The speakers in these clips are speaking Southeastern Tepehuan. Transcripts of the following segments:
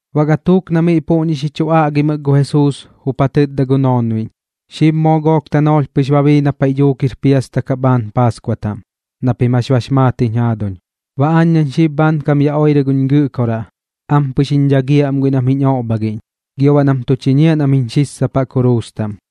Baꞌ gatuuk na miꞌ puꞌñi xi chu aꞌgimɨk gu Jesuus jup ja tɨtda gu noonbiꞌñ: ―Xib moo gook tanoolh pɨx ba bii na paiꞌ dhuuk jir piasta kaꞌ bhaan Paaskua taꞌm, na pim jax bax maat jiñ jaaduñ. Baꞌ aañ nañ xib bhaankam yaꞌ oirɨ guñ Gɨꞌkoraꞌ, ampɨx jiñ dhagiaꞌ am guiꞌ nam jiñ oꞌbhagiꞌñ, gio baꞌ nam tu chiñiaꞌ nam jiñ xissapaꞌ kuruus taꞌm.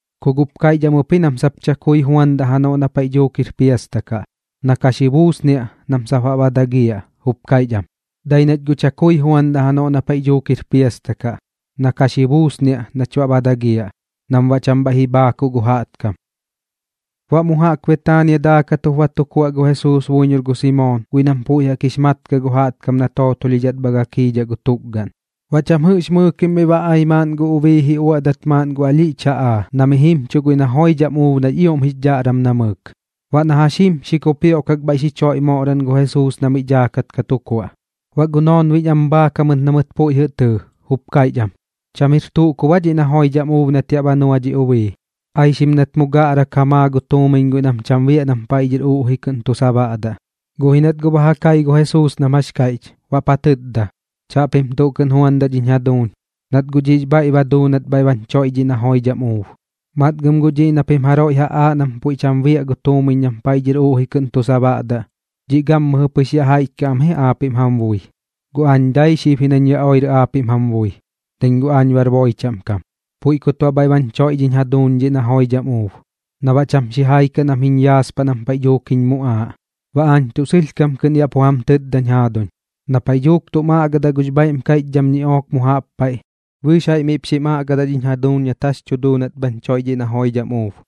Ku guꞌp kaiꞌch am ɨp ji nam sap chakui juandaꞌ janoꞌ na paiꞌ dhuuk jir piasta kaꞌ, na ka xi buusniaꞌ sap nam baꞌ ba dagiaꞌ, jup kaiꞌch am: ―Dai ji nach guꞌ chakui juandaꞌ janoꞌ na paiꞌ dhuuk jir piasta kaꞌ. Na ka xi buusniaꞌ nach baꞌ ba dagiaꞌ, nam baꞌ cham bhaiꞌ ji bhaakuꞌ gu jaꞌtkam. Baꞌ mu jaꞌk Betaania daakat jup ba tu kuaꞌ gu Jesuus buiñor gu Simoon guiꞌ nam puiꞌ jaꞌk jup jix mat kaꞌ gu jaꞌtkam na tootolhidhat bha gakiidhaꞌ gu tukgaꞌn. Baꞌ cham jɨꞌx mɨɨkim miꞌ ba ai maaꞌn gu ubii ji uaꞌdat maaꞌn gu alhiꞌch jaꞌaa na mi jimchuꞌ guiꞌ na joidham uub nax ioꞌm jix dhaꞌram namɨɨk. Baꞌ na jax jim xi kupioꞌkak bhaiꞌ xi choiꞌ moꞌran gu Jesuus na miꞌ daakat ka tu kuaꞌ. Baꞌ gu noonbiꞌñ am bhaak jamɨt na mɨt puiꞌ jɨꞌ tɨɨ, jup kaiꞌch am: ―¿Cham jir tuꞌ kub aa dhiꞌ na joidham uub nat yaꞌ ba nua dhi ubii? Aixim nat mu gaꞌrak ja maa gu tuumiñ guiꞌ nam cham biaꞌ nam paiꞌ dhɨr uꞌji kɨꞌn tu sabaꞌdaꞌ. Guꞌ ji nat guꞌ ba ja kai gu Jesuus nam jax kaiꞌch, baꞌp ja tɨtda: ―Chaꞌpim tuꞌ kɨꞌn juandaꞌ dhiñ jaduuñ, nat guꞌ dhiꞌx bhaiꞌ ba duu nat bhaiꞌ bañ choiꞌ dhiꞌ na joidham uub. Matgɨm guꞌ dhiꞌ na pim jaroiꞌ ja aaꞌ nam puiꞌ cham biaꞌ gu tuumiñ na paiꞌ dhɨr uꞌji kɨꞌn tu sabaꞌdaꞌ, dhiꞌ gammɨjɨ pɨx yaꞌx jaiꞌch kaꞌ am ji aapiꞌm jam bui. Guꞌ aañ dai xib ji nañ yaꞌ oirɨ aapiꞌm jam bui, nañ guꞌ aañ bar boi chaꞌm kam. Puiꞌ kut baꞌ bhaiꞌ bañ choiꞌ dhiñ jaduuñ dhiꞌ na joidham uub, na baꞌ cham xijai kaꞌ nam jiñ yaaspaꞌ nam paiꞌ dhuuk jiñ muꞌaaꞌ. Baꞌ aañ tuꞌ sɨlhkam kɨꞌn yaꞌ pu jam tɨtdañ jaaduñ, na paiꞌ dhuuk tum aꞌgadaꞌ gux bhaiꞌm kaiꞌchdham ñiꞌook mu jaꞌp paiꞌ, bɨɨx jaiꞌ miꞌp xim aꞌgadaꞌ dhiñ jaduuñ nat jax tu duu nat bhañ choiꞌ dhiꞌ na joidham uub.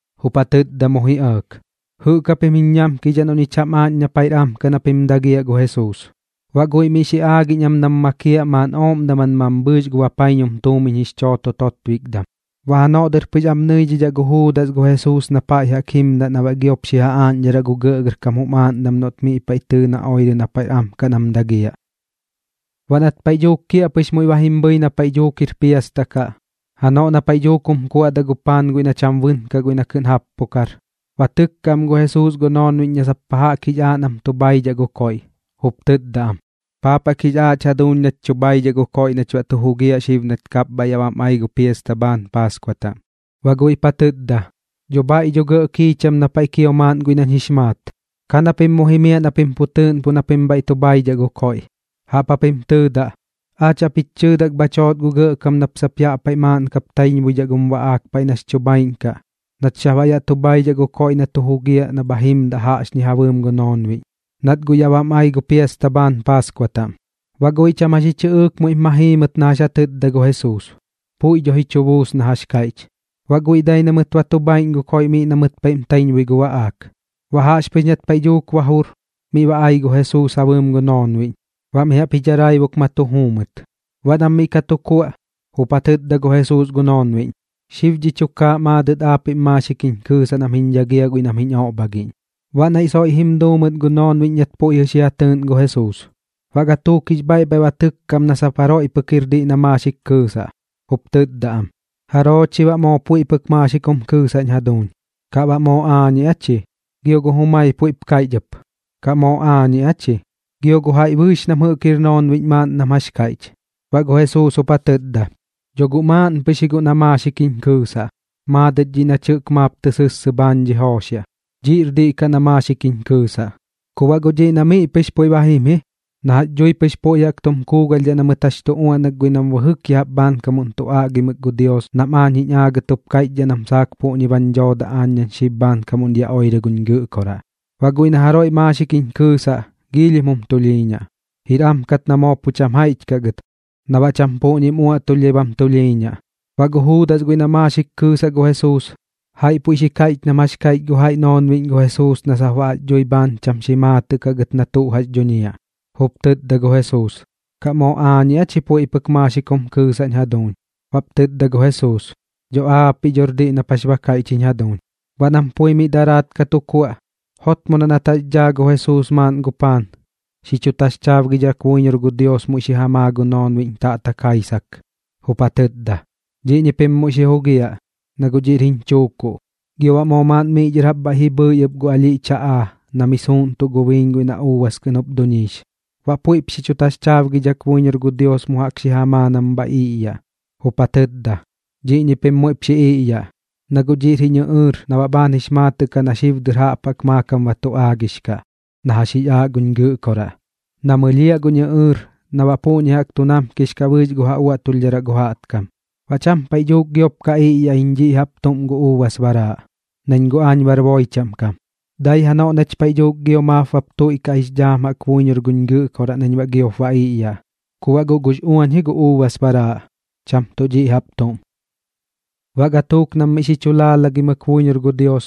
jup ja tɨtda mu ji ɇɇk: ―¿Jɨꞌk japim jiñ ñamkidhaꞌ noꞌ ñich jam aaꞌñ na paiꞌr am kaꞌ na pim dagiaꞌ gu Jesuus? Baꞌ guiꞌ miꞌ xi aagiꞌñ am nam makiaꞌ maaꞌn ooꞌm daman mambhɨɨx gu bapaiñum tuumiñ jix chooto totbikdam. Baꞌ janoꞌ dɨr pɨx am nɨidhidhaꞌ gu Juudas gu Jesuus na paiꞌ jaꞌk jax jimdaꞌ na baꞌ giop xi ja aaꞌñdharaꞌ gu gɇꞌgɇrkam jum aaꞌndam noꞌt miꞌ paiꞌ tɨɨ na oirɨ na paiꞌr am kaꞌ nam dagiaꞌ. Baꞌ nat paiꞌ dhuuk kiaꞌpɨx muiꞌ ba jim bhɨi na paiꞌ dhuuk jir piasta kaꞌ, janoꞌ na paiꞌ dhuuk jum kuaꞌdaꞌ gu paan guiꞌ na cham bɨnkaꞌ guiꞌ na kɨꞌn jappukar, ba tɨkka am gu Jesuus gu noonbiꞌñ na sap pa jaꞌk jix aaꞌ nam tu bhaidhaꞌ gu koiꞌ, jup tɨtda am: ―¿Paap jaꞌk jix aaꞌch jaduuñ nach tu bhaidhaꞌ gu koiꞌ nach baꞌ tu jugiaꞌ xib nat kapbhaiꞌ yaꞌ bam ai gu piasta bhaan Paaskua taꞌm? Baꞌ guiꞌp ja tɨtda: ―Dho bhaiꞌ dho gɇꞌ kiicham na paiꞌ kio maaꞌn guiꞌ nañ jix maat. Ka na pim mu jimiaꞌ na pim pu tɨɨꞌnpuꞌ na pim bhaiꞌ tu bhaidhaꞌ gu koiꞌ. Jaꞌp japim tɨɨdaꞌ: “Aach jaꞌp jich chɨɨdak bhach joot gu Gɇꞌkam nap sap yaꞌ paiꞌ maaꞌn kap ka taiñbuidhaꞌ gum baꞌaak paiꞌ nax chu bhaaiꞌñ kaꞌ nach sap baꞌ yaꞌ tu bhaidhaꞌ gu koiꞌ na tu jugiaꞌ na bha jimdaꞌ jaꞌxñi ja bɨɨm gu noonbiꞌñ, nat guꞌ yaꞌ bam ai gu piasta bhaan Paaskua taꞌm.” Baꞌ guiꞌ cham jax ji chɨꞌɨɨk muiꞌp ma jii mɨt na jax ja tɨtda gu Jesuus, puiꞌ dho ji chu buus na jax kaiꞌch. Baꞌ guiꞌ dai na mɨt ba tu bhaiꞌñ gu koiꞌ miꞌ na mɨt paiꞌm taiñbui gu baꞌaak. Baꞌ jaꞌxpɨx nat paiꞌ dhuuk ba jur, miꞌ ba ai gu Jesuus ja bɨɨm gu noonbiꞌñ, baꞌ mi jaꞌp ji dharaibuk ma tu juu mɨt. Baꞌ nam miꞌ ka tu kuaꞌ, jup ja tɨtda gu Jesuus gu noonbiꞌñ: ―Xib dhi tukaaꞌ maadɨt aapiꞌm maaxik jiñ kɨɨsaꞌ nam jiñ dhagiaꞌ guiꞌ nam jiñ oꞌbhagiꞌñ. Baꞌ naiꞌ soiꞌ jim duu mɨt gu noonbiꞌñ nat puiꞌ jɨꞌ xi ja tɨɨꞌn gu Jesuus. Baꞌ gatuuk jix bhaiꞌ bhaiꞌ ba tɨkka am na sap jaroiꞌ pɨk jir diꞌ na maaxik kɨɨsaꞌ, jup tɨtda am: ―¿Jaroo chi baꞌ moo puiꞌ pɨk maaxik jum kɨɨsaꞌñ jaduuñ? ¿Kaꞌ baꞌ moo aañiꞌ aa chi? Gio gu jumai puiꞌp kaiꞌch ɨp: ―¿Kaꞌ moo aañiꞌ aa chi? Gio gu jaiꞌ bɨɨx nam jɨꞌk jir noonbiꞌñ maaꞌn nam jax kaiꞌch. Baꞌ gu Jesuus jup ja tɨtda: ―Dho guꞌ maaꞌn pɨx ji guꞌ na maaxik jiñ kɨɨsaꞌ, maadɨt dhiꞌ nach jɨꞌk maap tɨ sɨssɨ bhaan dhi jooxiaꞌ. Dhiꞌr diꞌ kaꞌ na maaxik jiñ kɨɨsaꞌ. Ku baꞌ guꞌ dhiꞌ na miꞌ pɨx puiꞌ ba jim ji na jax dhui pɨx puiꞌ jaꞌk tum kuugalhdhaꞌ na mɨt jax tu uaꞌnak guiꞌ nam bɨjɨk ya jaꞌp bhaankam tu aꞌgimɨk gu Dios nam aañ jiñ aagɨt jup kaiꞌchdhaꞌ nam saak puꞌñi bañ dhoodaꞌ aañ nañ xib bhaankam yaꞌ oirɨ guñ Gɨꞌkoraꞌ. Baꞌ guiꞌ na jaroiꞌ maaxik jiñ kɨɨsaꞌ, giilhim jum tulhiiñaꞌ. Jir am kat na moo pu cham jaiꞌch kaꞌ gɨt na baꞌ cham puꞌñim uaꞌtulhdhai bam tulhiiñaꞌ. Baꞌ gu Juudas guiꞌ na maaxik kɨɨsaꞌ gu Jesuus, jaiꞌ puiꞌ xi kaiꞌch nam jax kaiꞌch gu jaiꞌ noonbiꞌñ gu Jesuus na sap baꞌ jax dhui bhaan cham xi maatɨꞌ kaꞌ gɨt na tuꞌ jax dhuñiaꞌ, jup tɨtda gu Jesuus: ―¿Kaꞌ moo aañiꞌ aa chi puiꞌ pɨk maaxik jum kɨɨsaꞌñ jaduuñ? Baꞌp tɨtda gu Jesuus: ―Dho aapiꞌ dhor diꞌ nap jax ba kaiꞌch jiñ jaduuñ. Baꞌ nam pui miꞌ daraat ka tu kuaꞌ, jotmodaꞌ nat jax dhaa gu Jesuus maaꞌn gu paan, xi chu taxchaabgidhak buiñor gu Dios muiꞌ xi ja maa gu noonbiꞌñ taꞌtak jaisak, jup ja tɨtda: ―Dhiꞌñi pim muiꞌp xi jugiaꞌ, na guꞌ dhiꞌr jiñ chuukuꞌ. Gio baꞌ moo maaꞌn miꞌ dhɨr jaꞌp bhaiꞌ ji bhɨi ɨp gu alhiꞌch jaꞌaa na mi suuꞌntuꞌ gu biiñ guiꞌ na uubas kɨꞌn jup duñiix, baꞌ puiꞌp xi chu taxchaabgidhak buiñor gu Dios mu jaꞌk xi ja maa nam bha iꞌyaꞌ, jup ja tɨtda: ―Dhiꞌñi pim muiꞌp xi iꞌyaꞌ, na guꞌ dhiꞌr jiñ ɨꞌɨɨr na baꞌ bhaan jix maatɨꞌ kaꞌ na xib dɨr jaꞌp jaꞌk maakam ba tu aagix kaꞌ na jax jix aaꞌ guñ Gɨꞌkoraꞌ, na mɨlhiaꞌ guñ ɨꞌɨɨr na baꞌ puꞌñi jaꞌk tu namkix kaꞌ bɨɨx gu ja uaꞌtulhdharaꞌ gu jaꞌtkam. Baꞌ cham paiꞌ dhuuk giop ka iꞌyaꞌ iñ dhi jaꞌp tuꞌm gu uubas baraaꞌ, nañ guꞌ aañ bar boi chaꞌm kam. Dai janoꞌ nach paiꞌ dhuuk gio maap bap tuiꞌkaꞌx dhaam jaꞌk buiñor guñ Gɨꞌkoraꞌ nañ baꞌ giop ba iꞌyaꞌ, ku baꞌ guꞌ gux uañ ji gu uubas baraaꞌ, cham tuꞌ dhiꞌ jaꞌp tuꞌm. Baꞌ gatuuk nam miꞌ xi chu laalagimɨk buiñor gu Dios,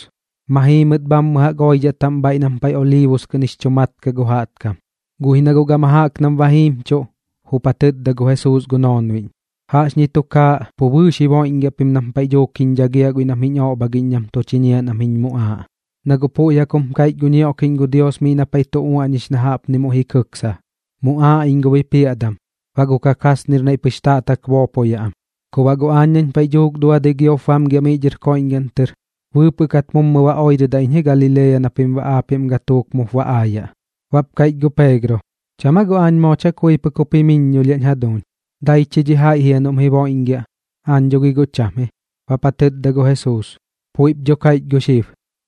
ma jii mɨt bhammɨ jaꞌk oidhaꞌ taꞌm bhaiꞌ nam paiꞌ Oliibus kɨꞌn jix chu mat kaꞌ gu jaꞌtkam. Guꞌ ji na guꞌ gama jaꞌk nam ba jiimchuꞌ, jup ja tɨtda gu Jesuus gu noonbiꞌñ: ―Jaꞌxñi tukaaꞌ pu bɨɨx ji boiꞌñgiaꞌ pim nam paiꞌ dhuuk jiñ dhagiaꞌ guiꞌ nam jiñ oꞌbhagiꞌñ nam tu chiñiaꞌ nam jiñ muꞌaaꞌ. Na guꞌ puiꞌ jaꞌk jum kaiꞌch gu ñioꞌkiꞌñ gu Dios miꞌ na paiꞌ tu uaꞌñix na jaꞌpni muiꞌ jim kɨksa: “Muꞌaaꞌ iñ gu bipiaꞌdam, baꞌ gu kakasnir naiꞌ pɨx taꞌtak boopoyaꞌ am.” Ku baꞌ guꞌ aañ nañ paiꞌ dhuuk duadɨi giop ba bamgiaꞌ miꞌ dhɨr koiꞌñgaꞌn tɨr, bɨɨpɨꞌ kat mummɨ ba oirɨdaꞌ iñ ji Galilea na pim baꞌ aapiꞌm gatuuk mup ba aayaꞌ. Baꞌp kaiꞌch gu Peegro: ―¿Cham aa guꞌ aañ moo chakui pɨk jup jimiññolhiaꞌñ jaduuñ? ¿Dai chi dhi jaiꞌ jia noꞌm jiboiꞌñgiaꞌ? Aañ dho gi guꞌ cham ji. Baꞌp tɨtda gu Jesuus: ―Puiꞌp dho kaiꞌch gu xib,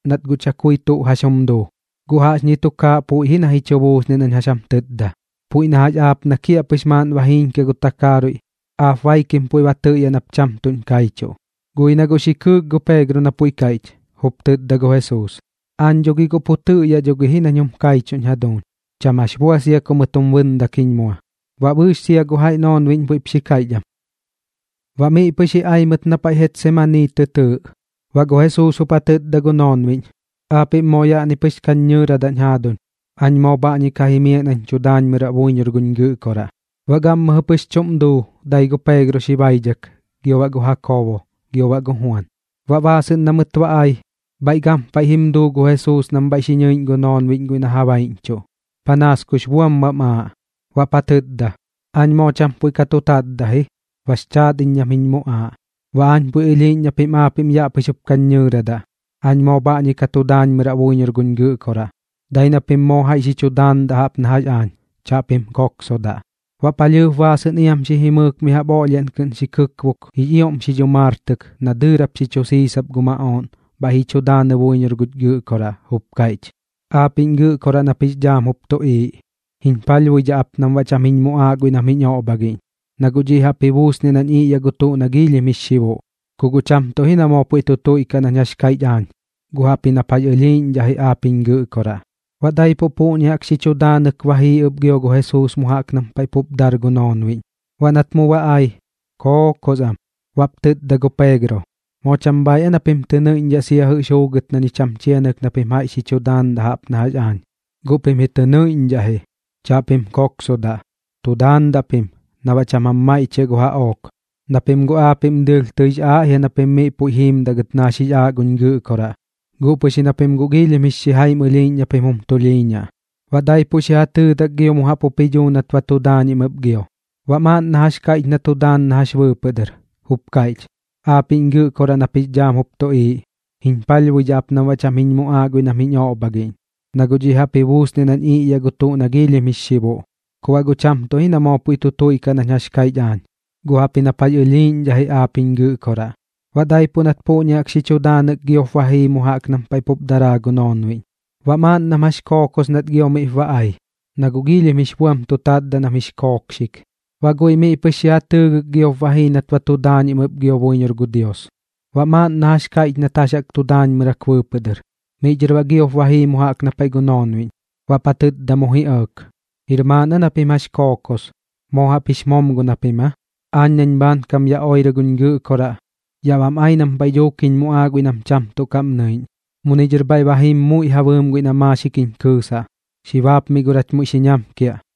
nat guꞌ chakui tuꞌ jax jum duu. Guꞌ jaꞌxñi tukaaꞌ puiꞌ ji na ji chu buusniaꞌ nañ jax jam tɨtda, puiꞌ na jax aap na kiaꞌpɨx maaꞌnnim ba jiiñkiaꞌ gu takaaruiꞌ, aap baikim puiꞌ ba tɨꞌyaꞌ nap cham tuꞌñ kaichuꞌ. Guꞌ ji na guꞌ xi kɨɨk gu Peegro na puiꞌ kaiꞌch, jup tɨtda gu Jesuus: ―Aañ dho gi guꞌ pu tɨꞌyaꞌ dho gi ji nañ jum kaichuꞌñ jaduuñ. Cham jax bua sia ku mɨt jum bɨndak jiñ mua. Baꞌ bɨɨx sia gu jaiꞌ noonbiꞌñ puiꞌp xi kaiꞌch am. Baꞌ miꞌ pɨx ji ai mɨt na paiꞌ Getsemanii tɨ tɨɨꞌ. Baꞌ gu Jesuus jup ja tɨtda gu noonbiꞌñ: ―Aapiꞌm moo yaꞌni pɨx kañ ñɨɨradaꞌñ jaaduñ. Aañ moo bhaꞌñi ka jimiaꞌ nañ tu daanmɨraꞌ buiñor guñ Gɨꞌkoraꞌ. Baꞌ gammɨjɨ pɨx chuꞌm duu dai gu Peegro xi baidhak, gio baꞌ gu Jakoobo, gio baꞌ gu Juan. Baꞌ baasɨꞌn na mɨt ba ai, bhaiꞌ gampaiꞌ jim duu gu Jesuus nam bhaiꞌ xi nɨiꞌñ gu noonbiꞌñ guiꞌ na ja baiꞌñchuꞌ, panaas kux buam bam aaꞌ. Baꞌp ja tɨtda: ―Aañ moo cham puiꞌ ka tu tatdaꞌ ji, bax chaat iñ nam jiñ muꞌaaꞌ. Baꞌ aañ puiꞌ ɨlhiiꞌñ na pim aapiꞌm yaꞌ pɨx jup kañ ñɨɨradaꞌ, aañ moo bhaꞌñi ka tu daanmɨraꞌ buiñor guñ Gɨꞌkoraꞌ. Dai na pim moo jaiꞌ xi chu daandaꞌ jaꞌp na jax aañ, chaꞌpim koksodaꞌ. Baꞌ palhɨɨp baasɨꞌn iam xi jimɨɨk mi jaꞌp oꞌlhiaꞌn kɨꞌn xi kɨkbok jix ioꞌm xi dhumaartɨk na dɨɨrap xi chu siisap gu maꞌooꞌn bhaiꞌ ji chu daanɨ buiñor guch Gɨꞌkoraꞌ, jup kaiꞌch: ―Aapiꞌñ Gɨꞌkoraꞌ nap jix dhaam jup tuꞌiiꞌ, jiñ palhbuidhaꞌ ap nam baꞌ cham jiñ muꞌaaꞌ guiꞌ nam jiñ oꞌbhagiꞌñ, na guꞌ dhiꞌ jaꞌp ji buusniaꞌ nañ iꞌyaꞌ gu tuꞌ na giilhim jix xibuꞌ. Ku guꞌ cham tuꞌ ji na moo puiꞌ tu tuiꞌkaꞌ nañ jax kaiꞌch aañ, guꞌ jaꞌpji nap jax ɨlhiiꞌñdhaꞌ ji aap jiñ Gɨꞌkoraꞌ. Baꞌ daipuꞌ puꞌñi jaꞌk xi chu daanɨk ba jii ɨp gio gu Jesuus mu jaꞌk nam paiꞌ pup dar gu noonbiꞌñ. Baꞌ nat mu ba ai, kookos am. Baꞌp tɨtda gu Peegro: ―¿Moo cham bhaaiꞌ aa na pim tɨ nɨiꞌñdhaꞌ sia jɨꞌx juugɨt na ñich jam chianɨk na pim jaiꞌ xi chu daandaꞌ jaꞌp na jax aañ? Guꞌ pim ji tɨ nɨiꞌñdhaꞌ ji, chaꞌpim koksodaꞌ. Tu daandaꞌ pim na baꞌ cham jam maiꞌchiaꞌ gu jaꞌook. Na pim guꞌ aapiꞌm dɨɨlh tɨix aaꞌ jia na pim miꞌ puiꞌ jiimdaꞌ gɨt na jax jix aaꞌ guñ Gɨꞌkoraꞌ, guꞌ pɨx ji na pim guꞌ giilhim jix xijaim ɨlhiiꞌñ na pim jum tulhiiñaꞌ. Baꞌ daipuꞌ xi ja tɨɨdak gio mu jaꞌk jup ji dhuu nat ba tu daañim ɨp gio. Baꞌ maaꞌn na jax kaiꞌch na tu daan na jax bɨɨpɨꞌ dɨr, jup kaiꞌch: ―Aapiꞌñ Gɨꞌkoraꞌ nap jix dhaam jup tuꞌiiꞌ, jiñ palhbuidhaꞌ ap nam baꞌ cham jiñ muꞌaaꞌ guiꞌ nam jiñ oꞌbhagiꞌñ, na guꞌ dhiꞌ jaꞌp ji buusniaꞌ nañ iꞌyaꞌ gu tuꞌ na giilhim jix xibuꞌ. Ku baꞌ guꞌ cham tuꞌ ji na moo puiꞌ tu tuiꞌkaꞌ nañ jax kaiꞌch aañ, guꞌ jaꞌpji nap jax ɨlhiiꞌñdhaꞌ ji aap jiñ Gɨꞌkoraꞌ. Baꞌ daipuꞌ nat puꞌñi jaꞌk xi chu daanɨk giop ba jii mu jaꞌk nam paiꞌ pup daraa gu noonbiꞌñ. Baꞌ maaꞌn nam jax kookos nat gio miꞌp ba ai, na guꞌ giilhim jix buam tu tatdaꞌ nam jix kookxik. Baꞌ guiꞌ miꞌ pɨx xi ja tɨɨgɨk giop ba jii nat ba tu daañim ɨp gio buiñor gu Dios, baꞌ maaꞌn na jax kaiꞌch nat jax jaꞌk tu daañmɨrak bɨɨpɨꞌ dɨr. Miꞌ dhɨr baꞌ giop ba jii mu jaꞌk na paiꞌ gu noonbiꞌñ, baꞌp ja tɨtda mu ji ɇɇk: ―¿Jir maaꞌn aa na pim jax kookos? ¿Moo jaꞌp jix momgon japim aa? Aañ nañ xib bhaankam yaꞌ oirɨ guñ Gɨꞌkoraꞌ, yaꞌ bam ai nam paiꞌ dhuuk jiñ muꞌaaꞌ guiꞌ nam cham tuꞌ kaꞌm nɨiꞌñ. Muni dhɨr bhaiꞌ ba jim muiꞌ ja bɨɨm guiꞌ na maaxik jiñ kɨɨsaꞌ. Xi baapmiꞌ gor jach muiꞌ xi ñamkiaꞌ.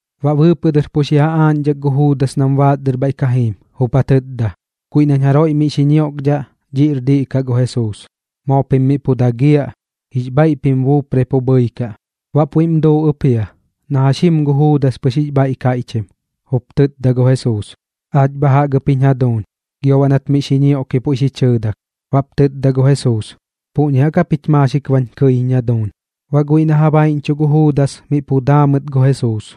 Baꞌ bɨɨpɨꞌ dɨr pu xi ja aaꞌñdhak gu Juudas nam baas dɨr bhaiꞌ ka jiim, jup ja tɨtda: ―Guiꞌ nañ jaroiꞌ miꞌ xi ñioꞌkdhaꞌ, dhiꞌ jɨꞌr diꞌ kaꞌ gu Jesuus. Moo pim miꞌ pu dagiaꞌ, jix bhaiꞌ pim buuprai pu bhɨikaꞌ. Baꞌ puiꞌm duu ɨp jia, na jax jim gu Juudas pɨx jix bhaiꞌ kaiꞌchim, jup tɨtda gu Jesuus: ―¡Aach bha jaꞌk ɨp jiñ jaduuñ! Gio baꞌ nat miꞌ xi ñioꞌki puiꞌ xi chɨɨdak. Baꞌp tɨtda gu Jesuus: ―¿Puꞌñi jaꞌk japich maaxik bañ kɨiñ jaduuñ? Baꞌ guiꞌ na ja baiꞌñchuꞌ gu Juudas miꞌ pu daa mɨt gu Jesuus.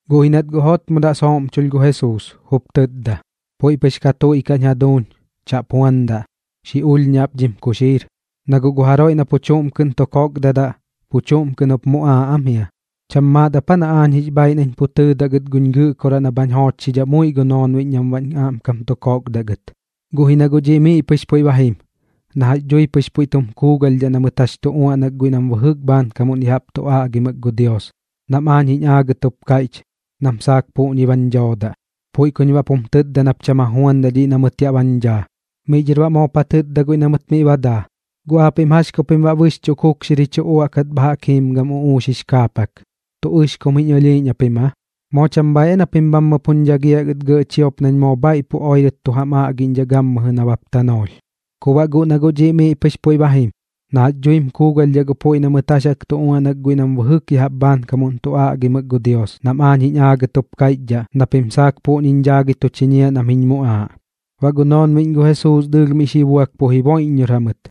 Guꞌ ji nat guꞌ jotmodaꞌ sooꞌmchulh gu Jesuus, jup tɨtda: ―Puiꞌ pɨx ka tuiꞌkaꞌñ jaduuñ. Chaꞌp juandaꞌ. Xi ulhñaꞌ ap dhim kuxiir. Na guꞌ gu jaroiꞌ na pu chuꞌm kɨꞌn tu kokdadaꞌ, pu chuꞌm kɨꞌn jup muꞌaaꞌ am jia. ¿Cham maat ap aa na aañ jix bhaiꞌ nañ pu tɨɨdaꞌ gɨt guñ Gɨꞌkoraꞌ na bhañ joochxidhaꞌ muiꞌ gu noonbiꞌñ nam baꞌñ aꞌmkam tu kokdaꞌ gɨt? Guꞌ ji na guꞌ dhiꞌ miꞌ pɨx puiꞌ ba jim na jax dhui pɨx jum kuugalhdhaꞌ na mɨt jax jaꞌk tu uaꞌnak guiꞌ nam bɨjɨk bhaankam ya jaꞌp tu aꞌgimɨk gu Dios nam aañ jiñ aagɨt jup kaiꞌchdhaꞌ nam saak puꞌñi bañ dhoodaꞌ. Puiꞌ kuñ baꞌp jum tɨtda nap cham ja juandaꞌ dhiꞌ na mɨt yaꞌ bañ dhaa. Miꞌ dhɨr baꞌ moop ja tɨtda guiꞌ na mɨt miꞌ ba daa: ―¿Guꞌ aapiꞌm jax ku pim baꞌ bɨxchuꞌ kukxir ji chu uaꞌkat bha jaꞌk jiim gam uꞌuux jix kaapak? ¿Tuꞌ ɨxkum jiñ ɨlhiiꞌñ japim aa? ¿Moo cham bhaaiꞌ aa na pim bhammɨ puñ dhagiaꞌ gɨt gɇꞌ chiop nañ moo bhaiꞌ pu oirɨt tu jam aꞌgiꞌñdhaꞌ gammɨjɨ nabap tanoolh? Ku baꞌ guꞌ na guꞌ dhiꞌ miꞌ pɨx puiꞌ ba jim na jax dhuim kuugalhdhaꞌ gu puiꞌ na mɨt jax jaꞌk tu uaꞌnak guiꞌ nam bɨjɨk ya jaꞌp bhaankam tu aꞌgimɨk gu Dios nam aañ jix aagɨt jup kaiꞌchdhaꞌ na pim saak puꞌñiñ dhaagɨi tu chiñiaꞌ nam jiñ muꞌaaꞌ. Baꞌ gu noonbiꞌñ gu Jesuus dɨɨlh miꞌ xi buak pu jiboiꞌññor jamɨt.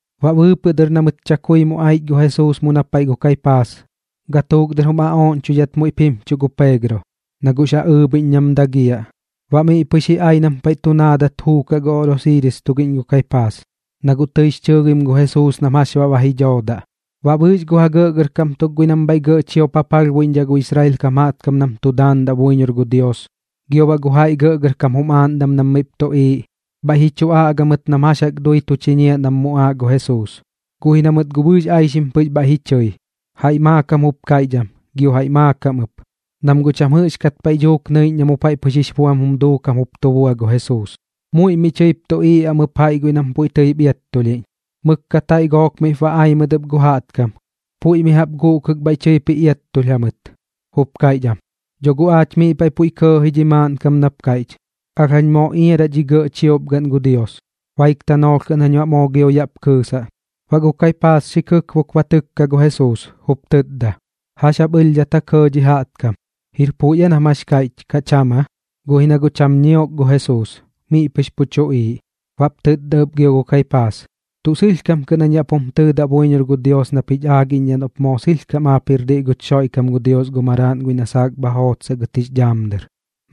Baꞌ bɨɨpɨꞌ dɨr na mɨt chakui mu aich gu Jesuus mu na paiꞌ gu Kaipaas, gatuuk dɨr jum aꞌooꞌñchoidhat muiꞌp jimchuꞌ gu Peegro, na guꞌx ja ɨɨbhiꞌñ nam dagiaꞌ. Baꞌ miꞌ pɨx ji ai nam paiꞌ tu naadat juukaꞌ gu oꞌrosiiris tugiꞌñ gu Kaipaas, na guꞌ tɨix chɨɨgim gu Jesuus nam jax baꞌ ba ji dhoodaꞌ. Baꞌ bɨɨx gu ja gɇꞌgɇrkam tuk guiꞌ nam bhaiꞌ gɇꞌ chiop ja palhbuiꞌñdhaꞌ gu Israel kam jaꞌtkam nam tu daandaꞌ buiñor gu Dios, gio baꞌ gu jaiꞌ gɇꞌgɇrkam jum aaꞌndam nam miꞌp tuꞌiiꞌ, bhaiꞌ ji chu aꞌga mɨt nam jax jaꞌk dui tu chiñiaꞌ nam muꞌaaꞌ gu Jesuus. Guꞌ ji na mɨt guꞌ bɨɨx aixim pɨx bhaiꞌ ji chɨi, jaiꞌ maakam jup kaiꞌch am, gio jaiꞌ maakam ɨp, nam guꞌ cham jɨꞌxkat paiꞌ dhuuk nɨiꞌñ na mu paiꞌ pɨx jix buam jum duukam jup tu bua gu Jesuus. Muiꞌ miꞌ tɨip tuꞌiiꞌ am ɨp jaiꞌ guiꞌ nam puiꞌ tɨip iattulhiꞌñ. Mɨkkat jaiꞌ gook miꞌp ba ai mɨt ɨp gu jaꞌtkam, puiꞌ mi jaꞌp guꞌkɨk bhaiꞌ tɨip ji iattulh jamɨt, jup kaiꞌch am: ―Dho guꞌ aach miꞌ paiꞌ puiꞌ kɇɇ ji dhi maaꞌnkam nap kaiꞌch: “Alh jañ moo iaraꞌ dhi gɇꞌ chiop gaꞌn gu Dios, baik tanoolh kɨꞌn jañ baꞌ moo gio yaꞌp kɨɨsaꞌ.” Baꞌ gu Kaipaas xi kɨkbok ba tɨkka gu Jesuus, jup tɨtda: ―¿Jax jap ɨlhdhat ja kɇɇ dhi jaꞌtkam? ¿Jir puiꞌ aa nam jax kaiꞌch, kaꞌ cham aa? Guꞌ ji na guꞌ cham ñiok gu Jesuus, miꞌ pɨx pu tuꞌiiꞌ. Baꞌp tɨtda ɨp gio gu Kaipaas: ―Tuꞌ sɨlhkam kɨꞌn jañ yaꞌ pum tɨtda buiñor gu Dios nap jich aagiꞌñdhaꞌ noꞌp moo sɨlhkam aap jir diꞌ guch Xoiꞌkam gu Dios gu Maraaꞌn guiꞌ na saak bha jootsaꞌ gɨt jix dhaam dɨr.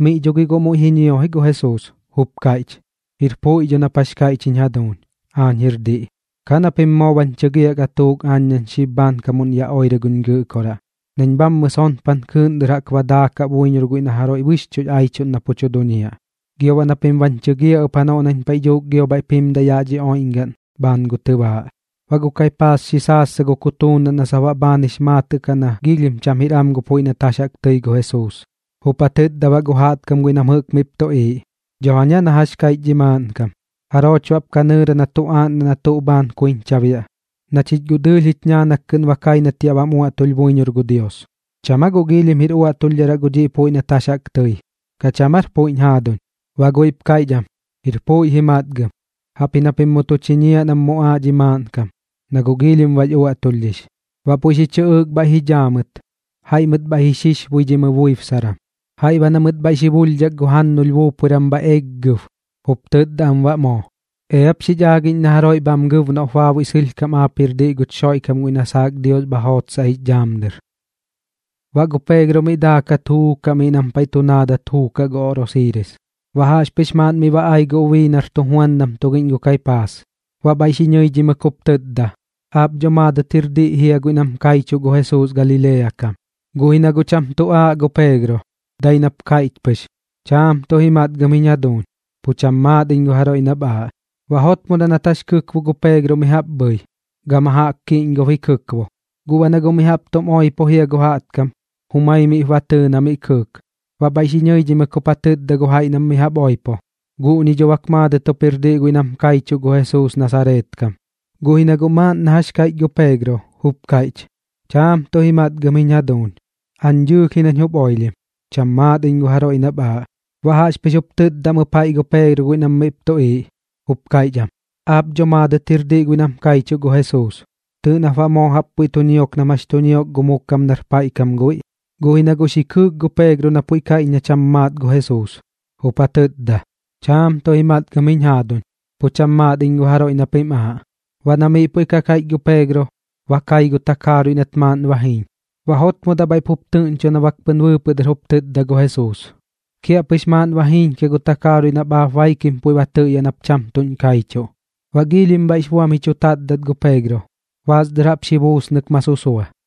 Miꞌ dho gi guꞌ muiꞌ ji ñio ji gu Jesuus, jup kaiꞌch: ―Jir puiꞌ dho nap jax kaiꞌch jiñ jaduuñ. Aañ jir diꞌ. Ka na pim moo bañ chɨgiaꞌ gatuuk aañ nañ xib bhaankamuꞌn yaꞌ oirɨ guñ Gɨꞌkoraꞌ, nañ bhammɨ sonpan kɨɨꞌn dɨr jaꞌk ba daakaꞌ buiñor guiꞌ na jaroiꞌ bɨxchuꞌx chu aichuꞌn na pu tu duñiaꞌ, gio baꞌ na pim bañ chɨgiaꞌ ɨp janoꞌ nañ paiꞌ dhuuk gio bhaiꞌp jimdaꞌ yaꞌ dhi oiꞌñgaꞌn bhaan gu tɨbaaꞌ. Baꞌ gu Kaipaas xi saassa gu kutuunaꞌn na sap baꞌ bhaan jix maatɨꞌ kaꞌ na giilhim cham jir am gu puiꞌ nat jax jaꞌk tɨi gu Jesuus. Jup ja tɨtda baꞌ gu jaꞌtkam guiꞌ nam jɨꞌk miꞌp tuꞌiiꞌ: ―Dho jaña na jax kaiꞌch dhi maaꞌnkam. ¿Jarooch baꞌp ka nɨɨra na tu aaꞌndaꞌ na tuꞌ bhaan kuiñcha biaꞌ, na chich guꞌ dɨɨlh jich ñaanak kɨꞌn ba kai nat yaꞌ bam uaꞌtulh buiñor gu Dios? ¿Cham aa guꞌ giilhim jir uaꞌtulhdharaꞌ gu dhiꞌ puiꞌ nat jax jaꞌk tɨi? ¿Kaꞌ cham aar puiꞌñ jaaduñ? Baꞌ guiꞌp kaiꞌch am: ―Jir puiꞌ ji matgɨm, jaꞌpji na pim mu tu chiñiaꞌ nam mu muꞌaaꞌ dhi maaꞌnkam, na guꞌ giilhim bax uaꞌtulhdhix. Baꞌ puiꞌ xi chɨꞌɨɨk bhaiꞌ ji dhaa mɨt, jaiꞌ mɨt bhaiꞌ ji xixbuidhimɨ buibsaran, jaiꞌ baꞌ na mɨt bhaiꞌ xi bulhdhak gu jannulh buupuiram bhaiꞌ xeeggɨb, jup tɨtda am baꞌ moo: ―Eap xich aagiꞌñ na jaroiꞌ bham gɨb noꞌp baabuiꞌ sɨlhkam aap jir diꞌ guch Xoiꞌkam guiꞌ na saak Dios bha jootsaꞌ jix dhaam dɨr. Baꞌ gu Peegro miꞌ daakat juukaꞌ miꞌ nam paiꞌ tu naadat juukaꞌ gu oꞌrosiiris. Baꞌ jaꞌxpɨx maaꞌn miꞌ ba ai gu ubii nar tujuandam tugiꞌñ gu Kaipaas, baꞌ bhaiꞌ xi ñɨidhimɨk jup tɨtda: ―Aap dho maadɨt jir diꞌ jia guiꞌ nam kaichuꞌ gu Jesuus Galilea kam. Guꞌ ji na guꞌ cham tu aaꞌ gu Peegro, dai nap kaiꞌch pɨx: ―Chaam tuꞌ ji matgɨm jiñ jaduuñ. Pu cham maat iñ gu jaroiꞌ nap aaꞌ. Baꞌ jotmodaꞌ nat jax kɨkbo gu Peegro mi jaꞌp bhɨi, gama jaꞌk kiꞌñgob ji kɨkbo. Gu baꞌ na guꞌ mi jaꞌp tum oipo jia gu jaꞌtkam, jumai miꞌp ba tɨɨ na miꞌ kɨɨk. Baꞌ bhaiꞌ xi ñɨidhimɨk jup ja tɨtda gu jaiꞌ nam mi jaꞌp jup oipo: ―Guꞌñi dho bak maadɨt jup jir diꞌ guiꞌ nam kaichuꞌ gu Jesuus Nasareet kam. Guꞌ ji na guꞌ maaꞌn na jax kaiꞌch gu Peegro, jup kaiꞌch: ―Chaam tuꞌ ji matgɨm jiñ jaduuñ. Aañ dɨɨlh ji nañ jup oilhim. Pu cham maat iñ gu jaroiꞌ nap aaꞌ. Baꞌ jaꞌxpɨx jup tɨtda am ɨp jaiꞌ gu Peegro guiꞌ nam miꞌp tuꞌiiꞌ, jup kaiꞌch am: ―Aap dho maadɨt jir diꞌ guiꞌ nam kaichuꞌ gu Jesuus. Tɨɨꞌ nap baꞌ moo jaꞌp puiꞌ tu ñiok nam jax tu ñiok gu mu kam nar paiꞌ kam guiꞌ. Guꞌ ji na guꞌ xi kɨɨk gu Peegro na puiꞌ kaiꞌch na cham maat gu Jesuus, jup ja tɨtda: ―Chaam tuꞌ ji matgɨm jiñ jaaduñ. Pu cham maat iñ gu jaroiꞌ na pim aaꞌ. Baꞌ na miꞌ puiꞌ ka kaiꞌch gu Peegro, ba kai gu takaaruiꞌ nat maaꞌn ba jiiñ. Baꞌ jotmodaꞌ bhaiꞌ pup tɨꞌñcho na bak pɨn bɨɨpɨꞌ dɨr jup tɨtda gu Jesuus: “Kiaꞌpɨx maaꞌn ba jiiñkiaꞌ gu takaaruiꞌ nap aap baikim puiꞌ ba tɨꞌyaꞌ nap cham tuꞌñ kaichuꞌ.” Baꞌ giilhim bhaiꞌx buam ji chu tatdat gu Peegro, baas dɨr jaꞌp xi buusnɨk ma susua.